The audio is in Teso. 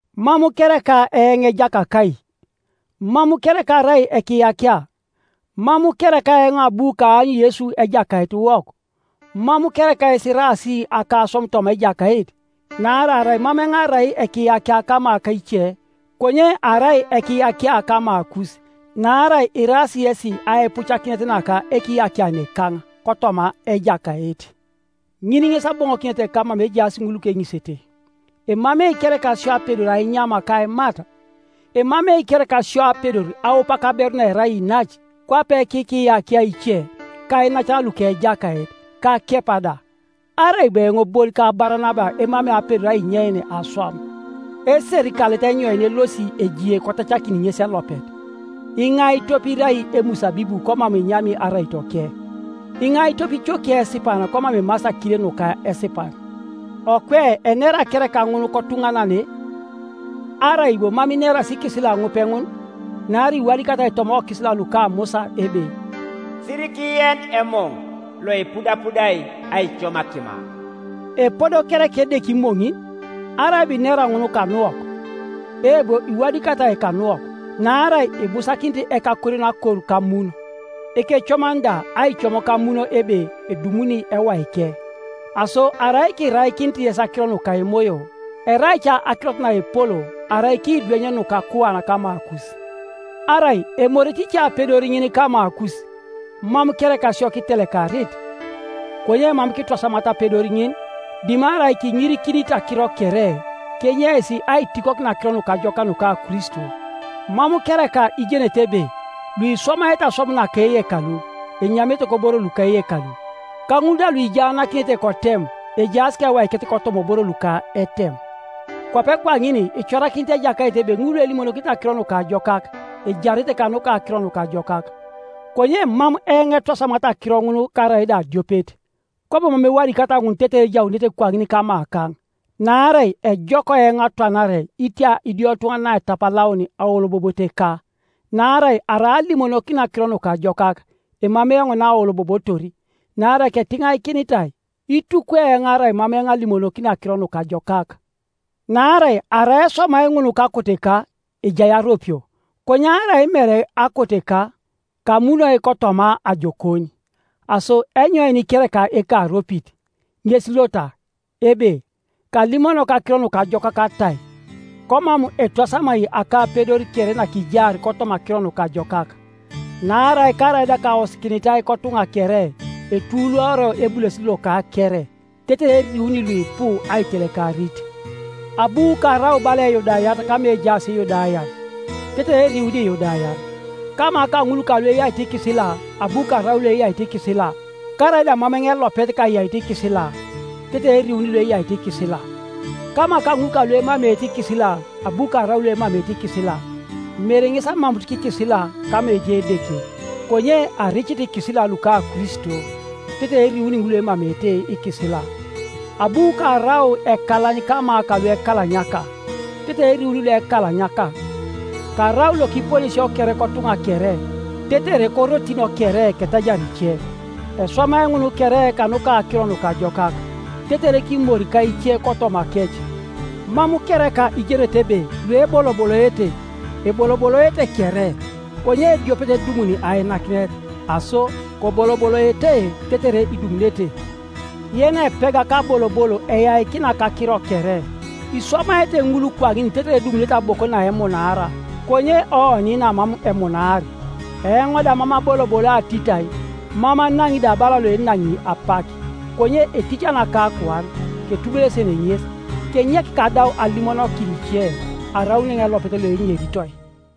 Mam kereka eoŋ ejakakai? Mam kereka arai ekiyakia? Mam kereka eoŋ abu kaany Yesu Ejakaitiwok? Mam kereka yes iraas akaswam toma Ejakait? Naarai arai mam eoŋ arai ekiyakia kama ka ice, konye arai ekiyakia kamakus; naarai iraas yesi aipucakinet naka ekiyakianekaŋ kotoma Ejakait. Ŋin ŋes aboŋokineteka mama ejaas ŋul lukeŋisete. Emamei kereka sio apedor ainyam ka aimat? Emamei kereka sio apedor aup kaberu naerai inac, kwape kikiyakia ice, ka iinacan luka Ejakait, ka Kepa da? Arai bo eoŋ bon ka Baranaba emamei apedor ainyein aswam? Eserikalet enyoin elosi ejie kotacakin ŋes elopet? Iŋai tope irai emusabibu komam enyami araitoke? Iŋai tope icokiei esipan komam emasi akile nuka esipan? Okwe enera kereka ŋun kotuŋanane? Arai bo mam inerasi ikisila ŋupe ŋun? Naarai iwadikatai toma okisila luka Musa ebe, “Sirikien emoŋ loipudapudai aicom akima.” Epodo kereka Edeke imoŋin? Arai bo inera ŋun kanuwok? Eebo, iwadikatai kanuwok, naarai ibusakinit ekakorion akor kamun, ekecoman da aicom kamun ebe edumuni ewaike. Aso arai kiraikinit yes akiro nuka emoyo, erai ca akirot naepol arai kiidweny nukakuan kamakus? Arai emorete ice apedor ŋin kamakus, mam kereka sio kitelekarit? Konye mam kitwasamata apedor ŋin, dimarai kiŋirikinit akiro kere, kenyeis aitikokin Akiro Nukajokak nuka Kristo. Mam kereka ijenete ebe luiswamaete aswam naka eyekalu enyamete koboro luka eyekalu, ka ŋul da luijaanakinete kotem ejaas kewaikec kotoma oboro luka etem? Kwape kwaŋin icorakinit Ejakait ebe ŋul luelimonokinete Akiro Nukajokak, ejarete kanuka Akiro Nukajokak. Konye mam eoŋ etwasamat akiro ŋun karaida adiopet. Kwabo mam ewadikat ŋun tetere ejaunete kwaŋin kamakaŋ. Naarai ejok eoŋ atwanare itia idiotuŋanan aitapalaun aoloboboteka. Naarai arai alimonokini Akiro Nukajokak, emamei eoŋ naaolobobotor. Naarai ketiŋaikinitai. Itukwi eoŋ arai mam eoŋ alimonokini Akiro Nukajokak! Naarai arai eswamai ŋun kakoteka, ejai aropio, konye arai mere akoteka, kamunoi kotoma ajokon. Aso enyoin kereka ekaropit? Ŋes lota, ebe, kalimonok Akiro Nukajokak atai, komam etwasamai akapedor kere nakijaar kotoma Akiro Nukajokak. Naarai karaida kaosikinitai kotuŋa kere, etuluoro ebulesit loka kere, tetere eriuni luipu aitelekarit. Abu karau bala Eyudayat kama ejaas lyudayan, tetere eriuni Iyudayan; kama kaŋul kalueyaito ikisila, abu karau loeyaito ikisila-karaida mam eoŋ elopet kayaito ikisila-tetere eriuni lueyaito ikisila. Kama kaŋul kaluemameete ikisila abu karau loemameete ikisila-mere ŋes amamuut kikisila kama ejai Edeke, konye aricit ikisila luka Kristo-tetere eriuni ŋul luemameete ikisila. Abu karau ekalany kama ka luekalanyaka, tetere eriuni luekalanyaka. Karau lokiponesio kere kotuŋa kere, tetere korotin kere ketajar ice. Eswamai ŋun kere kanuka Akiro Nukajokak, tetere kimori ka ice kotomakec. Mam kereka ijenete ebe lueboloboloete, eboloboloete kere, konye ediopet edumuni ainakinet? Aso koboloboloete tetere idumunete. Yenepega kabolobol eyaikina kakiro kere. Iswamaete ŋul kwaŋin tetere edumunete aboko naemunaar, konye oni namam emunaar. Eoŋ da mam aboloboloi atitai, mam anaŋi da bala loenaŋi apak; konye eticani akakuan, ketubulesen ŋes, kenyek kadau alimonokin ice, araun eoŋ elopet loeneritoi.